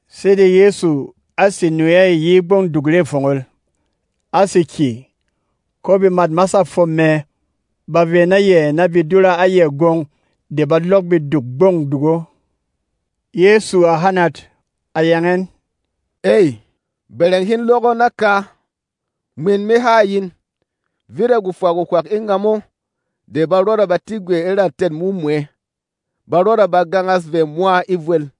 Sede Yɛsu á sè nu ɛ yi e Gbɔng Duk Re Fongol, á sè kyè, ko bemât masâ fwom mɛ ba vey na yɛ na be dura a yɛ gwong de ba lɔk beduk Gbɔng Duk o. Yɛsu a hanat, a yang ɛn, “Ey, bɛrɛng hin lɔk o naka! Mwin me ha a yin: Vit a gwofwa gwohwak e ngamo de ba rɔda ba tik gwɛ e ra tɛ̂t mumwɛ; ba rɔda ba gangas vɛ mwa e vwel.”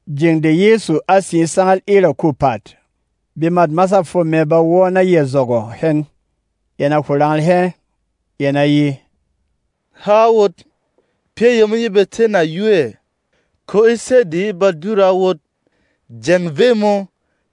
Jeng de Yɛsu á sè e sangal e Raku Pàt, bemât masâ fwom mɛ ba wɔ́ na yɛ zɔgɔ̂ hɛn. Yɛn a hwo rangal hɛ, yɛn a ye, “Hā a wot, pyɛ́ yemo ye ba té nayu ɛ? Ko e sɛ́ de ye ba dura a wot, jeng vey mō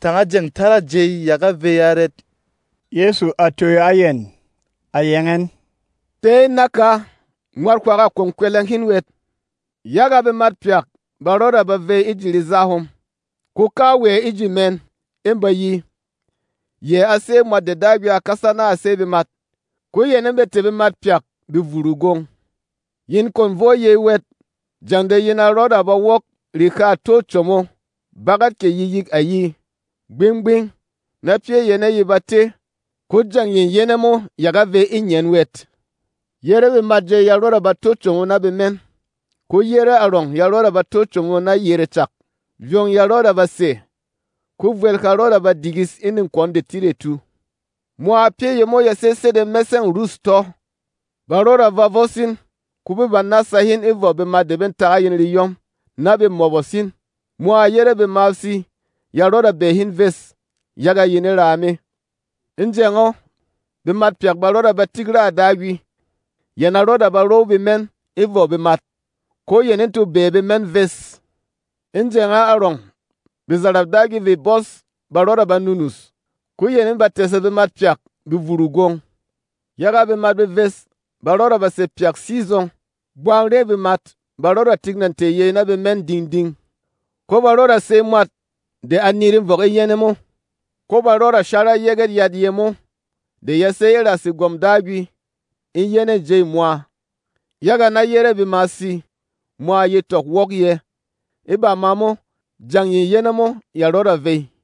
tanga jeng talâ jey ya ga vey arɛt?” Yɛsu a toyo a yɛn, a yang ɛn, “Tē in naka, mwat hwak a kwon kwɛlɛng hin wɛt! Yaga bemat pyak ba rɔda ba vey e ji reza hom, ko kawɛ e ji mɛn ê ba ye, yɛ a sé Mwat de Dagwi a kasa na a sey bemat. Ko yɛn ê ba tɛ̀ bemat pyak be vuru gwong. Yin kwon vo yey wɛt jeng de yin a rɔda ba wok rehâ tô como bagat kɛ yikyik ayi. Gbing-gbing na pyɛ́ yane ye ba té, ko jeng ye yɛnɛ mo ya ga vey e ngyen wɛt. Yére bemat jey ya rɔda ba tó como na bemɛn, ko yere arɔng ya rɔda ba tó como na yere cak. Vyong ya rɔda ba sè, ko vwel ha rɔda ba digis e nekwɔn detidetu. Mwa pyɛ́ yemo ya sé sede mɛsɛ̂ng rûs tɔ́. “Ba rɔda ba vos in, ko bê ba nása hin e vɔ bemat na be tak a yin reyɔm, na be mɔbɔs hin. Mwa yére bemasi ya rɔda bɛɛ hin ves, yaga yin e raa me. E jeng o, bemat pyak ba rɔda ba tik raà Dagwi, yɛn a rɔda ba row bemɛn e vɔ bemat, ko yɛn ê to bɛɛ bemɛn ves. E jeng o arɔng, bezarap Dagwi vê bɔs pyak ba rɔda ba nunus, ko yɛn ê ba tɛ̀sɛ bemat pyak be vuru gwong. Yaga bemat beves ba rɔda sè pyak sizɔng, bwarwêy bemat ba rɔda tik nà tɛ̀ yey na bemɛn ding-ding. Ko ba rɔda ba sey mwat de a niri vɔk e yɛnɛ mo. Ko ba rɔda ba shara Yɛgɛt Yat yemo de ya sé e ra Segwɔm Dagwi e yɛnɛ̂ jêy mwa, yaga na yére bemasî mwa ye tɔk wok yɛ̄. E bama mo, jeng ye yɛnɛ mo ya rɔda vey.”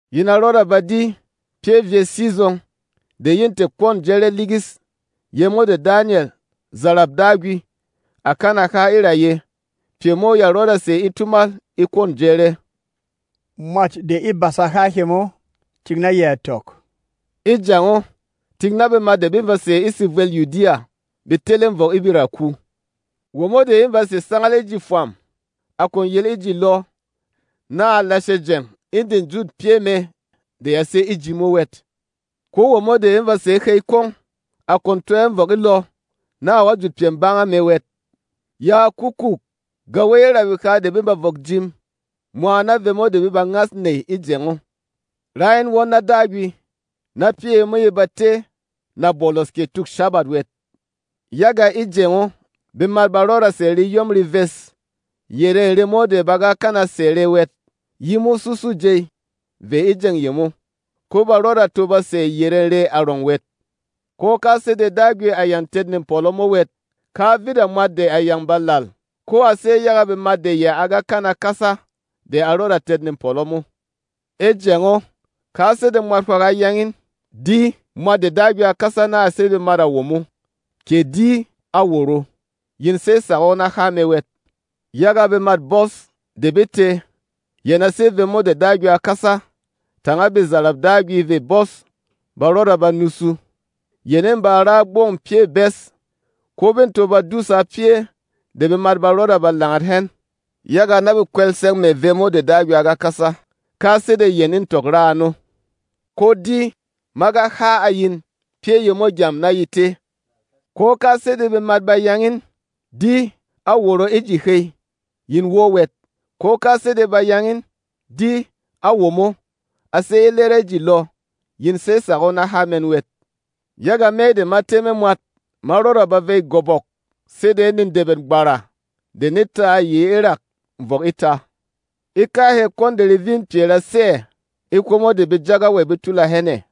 “Yin a rɔda ba di ‘Pyɛ vyes sizɔng de ye tɛ̀ kwɔ̂n jɛrɛ ligis’ yemo de Danyɛl, zarap Dagwi, à kana ha e ra yɛ. Pyɛ mo ya rɔda sè e tumal e kwɔ̂n jɛrɛ.” — Mwat de e basa há hemo, tik na yɛ a tɔk — “E jeng o, tik na bemat de be ba sè e sevwêl Yudiya be tele vɔk e beraku. Womo de ê ba sè sangal e ji fwam, a kwon yel e ji lɔ, na a lashe jeng e de jût pyɛ́ mɛ de ya sé e ji mo wɛt. Ko womo de ê ba sè e hey kwong, a kwon to ɛ vɔk e lɔ, na a wɔ̀ jut pyɛ banga mɛ wɛt. Yaa kukuuk! Gawey e ra beha de bê ba vɔk jim mwa na vemo de bê ba ngas nèy e jeng o! Rá in won na Dagwi, na pyɛ́ yemo ye ba té nabolos kɛ Tuk Shábat wɛt! Yaga e jeng o, bemat ba rɔda ba sɛ̀ reyɔm reves yere remo de ba ga kana sɛ̀ rɛ wɛt yimo susû jey vey e jeng yemo, ko ba rɔda to ba sɛ̀ yerê rɛ arɔng wɛt. Ko ka sede Dagwi à yâng tɛt nepɔlɔ mo wɛt, ka vit a mwat de a yâng ba làl. Ko a sé yaga bemat de yɛ a ga kana kasa de a rɔda tɛt nepɔlɔ mo. “E jeng o, ka sede mwat hwak a yang in, ‘Di, Mwat de Dagwi a kasa na a sey bemat á womo!’ kɛ ‘Di, á woro!’ — yin sey tsak o na há mɛ wɛt. Yaga bemât bɔs de be tē, yɛn a sé vemo de Dagwi a kasa, tanga bezarap Dagwi vê bɔs ba rɔda ba nusu. Yɛn ê ba ra gbɔng pyɛ̂ bes, ko bê to ba dúsa pyɛ́ de bemat ba rɔda ba langat hɛn, yaga na be kwɛlsɛng mɛ̀ vemo de Dagwi a ga kasa, ka sede yɛn ê tɔk ra ano. Ko di! Ma ga ha a yin pyɛ́ yemo gyam na ye té. “Ko ka sede bemat ba yang in, ‘Di, á woro e ji hey!’ yin wɔ́ wɛt. Ko ka sede ba yang in, ‘Di, á womo, a sé e lɛrɛ e ji lɔ!’ yin sey tsak o na há mɛn wɛt. Yaga Me de ma tɛ́ me mwat ma rɔda ba vey gobok sede nedɛbɛt gbara de ne ta yi e rak vɔk e tā. “E kahɛ kwɔn de revîn pyɛ ra sé ɛ̀, e hwomo de bejagawey be tula hɛn ɛ̀.”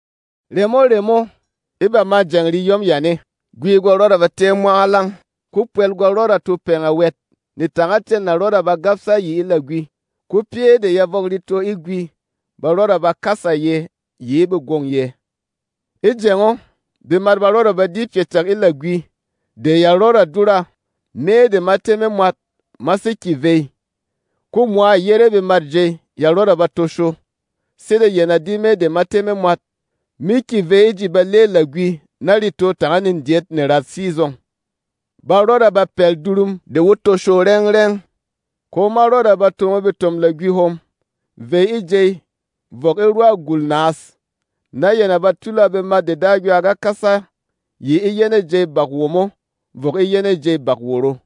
“Remo-remo, e bamâ jeng reyɔm yane, gwi gwa rɔda ba tɛ́ ɛ mwangalang, ko pwɛl gwa rɔda to pɛngɛ wɛt, netangacɛn na rɔda ba gabsa yi e lagwi, ko pyɛ́ de ya vɔk reto e gwi ba rɔda ba kàsa yɛ̄ yi e begwông yɛ̄. E jeng o, bemat ba rɔda ba di pyɛ cak e lagwi de ya rɔda dura, Me de ma tɛ́ me mwat ma sé kyè vey. Ko mwa yére bemat jey ya rɔda ba tosho, sede yɛn a di Me de ma tɛ́ me mwat me kyè vey e ji balê lagwi na reto tanga nedyɛt nerat sizɔng. Ba rɔda ba pɛl durum de wo tosho rɛng-rɛng, ko ma rɔda ba tomo betom-lagwi hom vey e jey vɔk e rwa gùl naas, na yɛn a ba tula bemat de Dagwi a ga kasa yi e yɛnɛ̂ jêy bak womo vɔk e yɛnɛ̂ jêy bak woro.”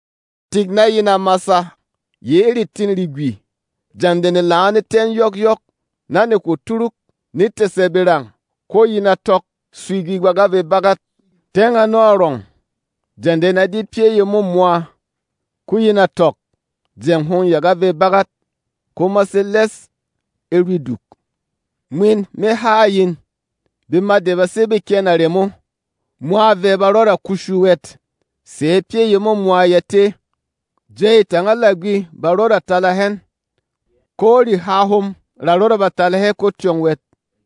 “Tik na yin a masa yi e retîn regwi. Jeng de nelang o ne tɛ́ ɛn yɔkyɔk na ne hwo turuk, ne tɛ̀sɛ berang, ko yin a tɔk, swigi gwa ga vey bagat. Tyɛng ano arɔng, jeng de yin a di pyɛ́ yemo mwa, ko yin a tɔk, jeng hom ya ga vey bagat, ko ma sé lɛs e rwi duk. Mwin me ha a yin: Bemat de ba sé beken a remo, mwa vɛ ba rɔda kushu wɛt, sɛ̌ pyɛ yemo mwa ya té. Jey tanga lagwi ba rɔda ba tala hɛn, ko reha hom ra rɔda ba tala hɛ ko tyɔng wɛt.”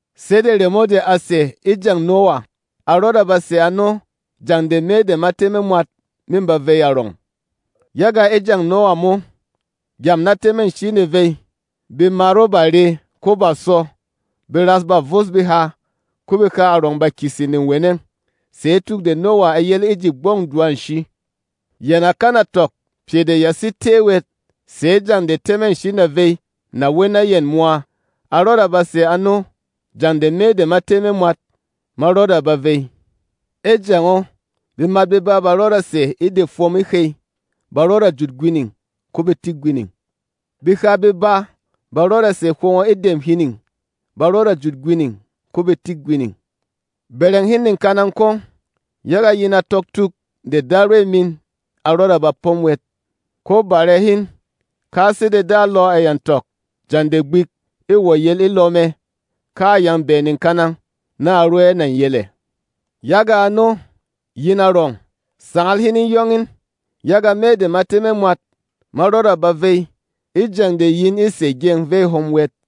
Sede remo de à sè e jeng Nowa, a rɔda ba sè ano jeng de Me de ma tɛ́ me mwat mê ba vey arɔng. Yaga e jeng Nowa mo, gyam na tɛmɛ-nshi ne vey, bemat o bà re, ko bà sɔ, beras bà vos beha, ko beha arɔng bà kyese neweneng sɛ̌ tuk de Nowa à yel e ji gbɔng dwa-nshi. Yɛn à kana tɔk pyɛ de ya sé té wɛt sɛ̌ jeng de tɛmɛ-nshi na vey wey na yɛn mwa. A rɔda ba sè ano jeng de Me de ma tɛ́ me mwat ma rɔda ba vey. E jeng o, bemat beba ba rɔda sè e de fwom e hey; ba rɔda jut gwining, ko be tik gwining. Beha beba ba rɔda sè hwongo e dem hining; ba rɔda jut gwining, ko be tik gwining. “Bɛrɛng hin nekanang kwong, yaga yin a tɔk tuk de Darwey min a rɔda ba pom wɛt. Ko bàre hin, ka sede dalɔ a yâng tɔk jeng de gbik ê wɔ̀ yel e lɔ mɛ, ka a yâng bɛɛ nekanang na a ro ɛ nà yel ɛ̀. Yaga ano, yin arɔng, sangal hin e yong in, yaga Me de ma tɛ́ me mwat ma rɔda ba vey e jeng de yin ê sè gyeng vey hom wɛt.”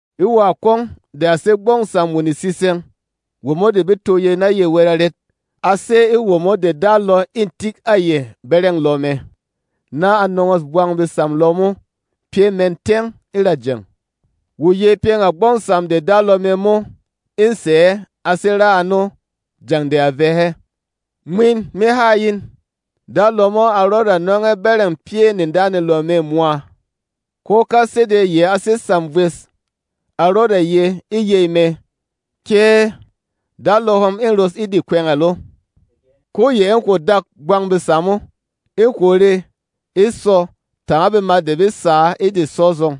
“E wǎ kwong de a sé gbɔng sam wo netsitsɛng, womo de be tó yey na yɛ wɛt arɛt? A sé e womo de dalɔ ê tik a yɛ bɛrɛng lɔ mɛ, na a nɔngɔ̂s bwang besam lɔ mo pyɛ́ mɛn tyɛng e ra jeng. Wo yey pyɛng a gbɔng sam de dalɔ mɛ mo ê sɛ̀ ɛ a sè ra ano jeng de a vɛ̄ hɛ. Mwin me ha a yin: Dalɔ mo a rɔda nɔng ɛ bɛrɛng pyɛ̂ nedanelɔ mɛ mwa. Ko ka sede yɛ a sé sam vwes, a rɔda ye e yey mɛ, ‘Kée! Dalɔ hom ê ros e de kwɛngɛl o.’ Ko yɛ ê hwo dak bwang besam o, ê hwo re, e sɔ tanga bemat de be sǎ e de sɔ zɔng.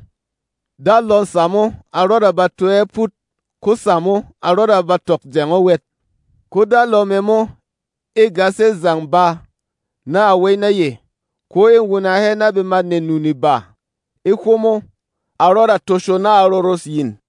Dalɔ̂ sam o a rɔda ba to ɛ pút, ko sam o a rɔda ba tɔk jeng o wɛt. Ko dalɔ mɛ mo ê gas ɛ zang ba na a wey na yɛ, ko ê wuna hɛ na bemât nenu-neba. E hwomo, a rɔda tosho na a roros yìn.”